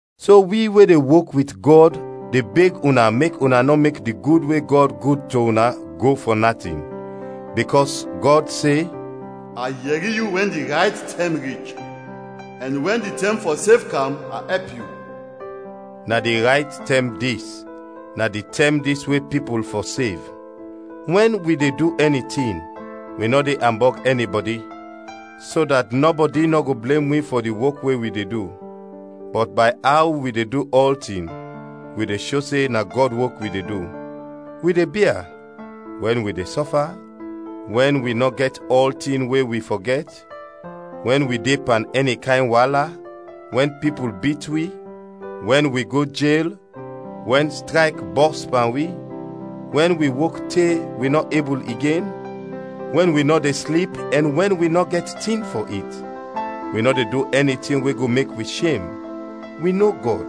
So, wi we de wok wit Gɔd de beg una mek una nɔ mek di gud we Gɔd gud to una go fɔ natin. Bikɔs Gɔd se, “A yɛri yu wɛn di rayt tɛm rich; ɛn wɛn di tɛm fɔ sev kam, a ɛp yu.” Na di rayt tɛm dis, na di tɛm dis we pipul fɔ sev! Wɛn wi de du ɛni tin, wi nɔ de ambɔg ɛnibɔdi, so dat nɔbɔdi nɔ go blem wi fɔ di wok we wi de du. Bɔt bay aw wi de du ɔltin, wi de sho se na Gɔd wok wi de du. Wi de bia: wɛn wi de sɔfa, wɛn wi nɔ gɛt ɔltin we wi fɔ gɛt, wɛn wi de pan ɛni kayn waala, wɛn pipul bit wi, wɛn wi go jel, wɛn strayk bɔs pan wi, wɛn wi wok te wi nɔ ebul igen, wɛn wi nɔ de slip ɛn wɛn wi nɔ gɛt tin fɔ it. Wi nɔ de du ɛni tin we go mek wi shem, wi no Gɔd,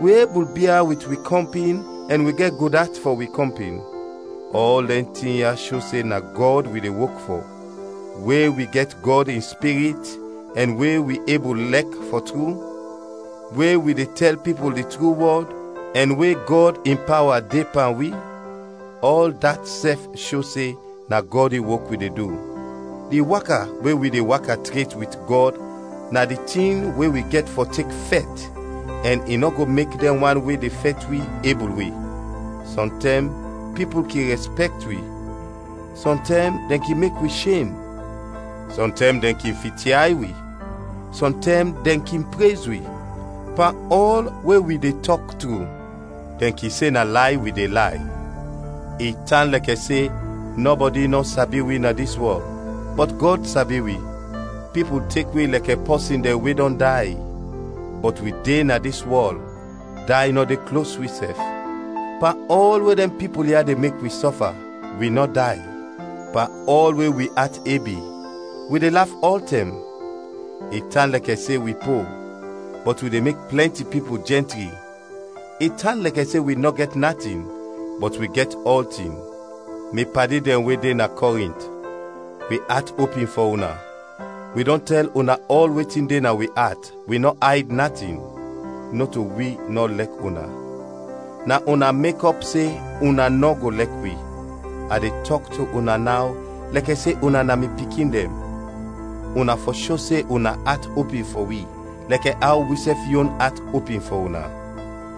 wi ebul bia wit wi kɔmpin ɛn wi gɛt gud at fɔ wi kɔmpin; ɔl dɛn tin ya sho se na Gɔd wi de wok fɔ; we wi gɛt Gɔd in Spirit ɛn we wi ebul lɛk fɔ tru, we wi de tɛl pipul di tru wɔd, ɛn we Gɔd in pawa de pan wi, ɔl dat sɛf sho se na Gɔd in wok wi de du. Di waka we wi de waka tret wit Gɔd na di tin we wi gɛt fɔ tek fɛt ɛn i nɔ go mek dɛn wan we de fɛt wi, ebul wi. Sɔntɛm pipul kin rɛspɛkt wi, sɔntɛm dɛn kin mek wi shem; sɔntɛm dɛn kin fityay wi, sɔntɛm dɛn kin prez wi. Pan ɔl we wi de tɔk tru, dɛn kin se na lay wi de lay; i tan lɛkɛ se nɔbɔdi nɔ sabi wi na dis wɔl, bɔt Gɔd sabi wi. Pipul tek wi lɛkɛ pɔsin dɛn we dɔn day, bɔt wi de na dis wɔl, day nɔ de klos wi sɛf. Pan ɔl we dɛn pipul ya de mek wi sɔfa, wi nɔ day; pan ɔl we wi at ebi, wi de laf ɔltɛm; i tan lɛkɛ se wi po, bɔt wi de mek plɛnti pipul jɛntri; i tan lɛkɛ se wi nɔ gɛt natin, bɔt wi gɛt ɔltin. Mi padi dɛn we de na Kɔrint, wi at opin fɔ una, wi dɔn tɛl una ɔl wetin de na wi at, wi nɔ ayd natin. Nɔto wi nɔ lɛk una; na una mekɔp se una nɔ go lɛk wi. A de tɔk to una naw lɛkɛ se una na mi pikin dɛn: una fɔ sho se una at opin fɔ wi, lɛkɛ aw wisɛf yon at opin fɔ una!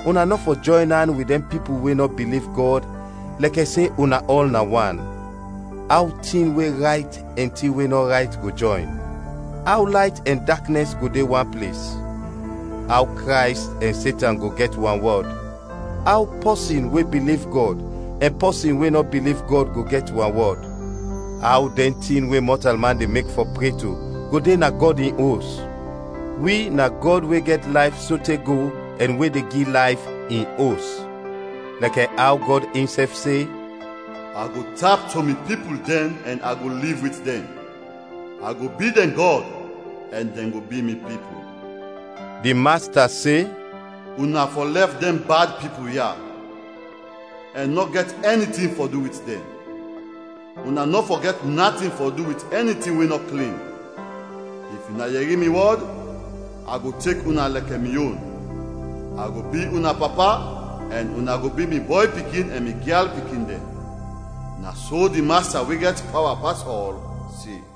Una nɔ fɔ jɔyn an wit dɛn pipul we nɔ biliv Gɔd lɛkɛ se una ɔl na wan, aw tin we rayt ɛn tin we nɔ rayt go jɔyn? Aw layt ɛn daknɛs go de wan ples? Aw Krays ɛn Setan go gɛt wanwɔd? Aw pɔsin we biliv Gɔd ɛn pɔsin we nɔ biliv Gɔd go gɛt wanwɔd? Aw dɛn tin we mɔtalman de mek fɔ pre to go de na Gɔd in Os? Wi na Gɔd we gɛt layf sote go ɛn we de gi layf, in os! Lɛkɛ aw Gɔd insɛf se, “A go tap to mi pipul dɛn ɛn a go liv wit dɛn; a go bi dɛn Gɔd, ɛn dɛn go bi mi pipul.” Di Masta se, “Una fɔ lɛf dɛn bad pipul ya, ɛn nɔ gɛt ɛnitin fɔ du wit dɛn. Una nɔ fɔ gɛt natin fɔ du wit ɛnitin we nɔ klin. If una yɛri mi wɔd, a go tek una lɛkɛ mi yon. A go bi una Papa ɛn una go bi mi bɔy pikin ɛn mi gyal pikin dɛn, na so di Masta we gɛt pawa pas ɔl, se.”